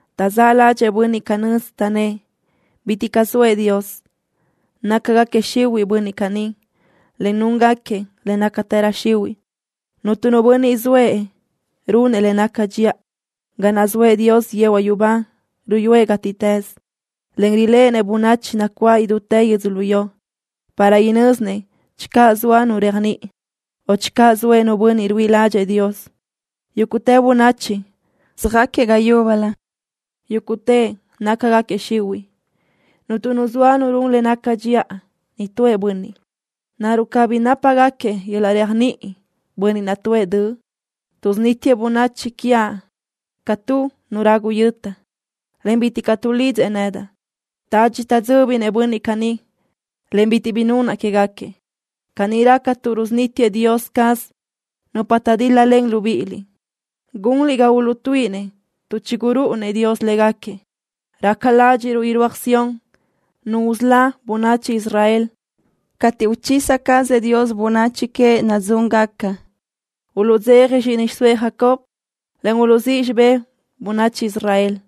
Taʼzáʼ ládxëʼë bönniʼ canö́z, taʼnnë́ʼ: “Bitiʼ caʼ zoëʼ Dios.” Nácagaquiëʼ xihuiʼ bönniʼ caní, en núngaquiëʼ le nácatërö xihuiʼ. Cuntu nu bönniʼ zoëʼ runëʼ le naca dxiʼa. Ga naʼ zoëʼ Dios yehuaʼ yubá ruyúëʼ gátiʼtës, en riléʼenëʼ bönachi nacuáʼ idútë yödzölió, para inö́zinëʼ channö zoa nu réajniʼi, o channö zoëʼ nu bönniʼ ruíʼi ládxëʼë Dios. Yúguʼtë bönachi söjáquiëʼ ga yúbölö. Yúguʼtëʼ nácagaquiëʼ xihuiʼ. Cuntu nu zoa run le naca dxiʼa, nitúëʼ bönniʼ. ¿Naruʼ cabí nápagaquiëʼ yöl-laʼ réajniʼi bönniʼ naʼ tuʼë döʼ? Tuʼsunítiëʼ bönachi quiaʼ ca tu nu ragu yöta, en bitiʼ caʼ tuʼlidzëʼ nedaʼ. Tadxi taʼdzö́binëʼ bönniʼ caní, en bitiʼ bi nunaʼ quégaquiëʼ. Caní raca tuʼ rusunítiëʼ Dios caz nupa taʼdíl-lalen libíʼiliʼ. Gunliʼ ga uluʼtuíʼinëʼ tuʼ chigurúʼunëʼ Dios légaquiëʼ. Raca ládxiʼruʼ irúaj Sión Nu usölá bönachi Israel. Cateʼ uchisa cazëʼ Dios bönachi queëʼ nadzúngaca, uluʼdzeja zxíʼini xiʼsóëʼ Jacob, en uluʼzíʼ xibé bönachi Israel.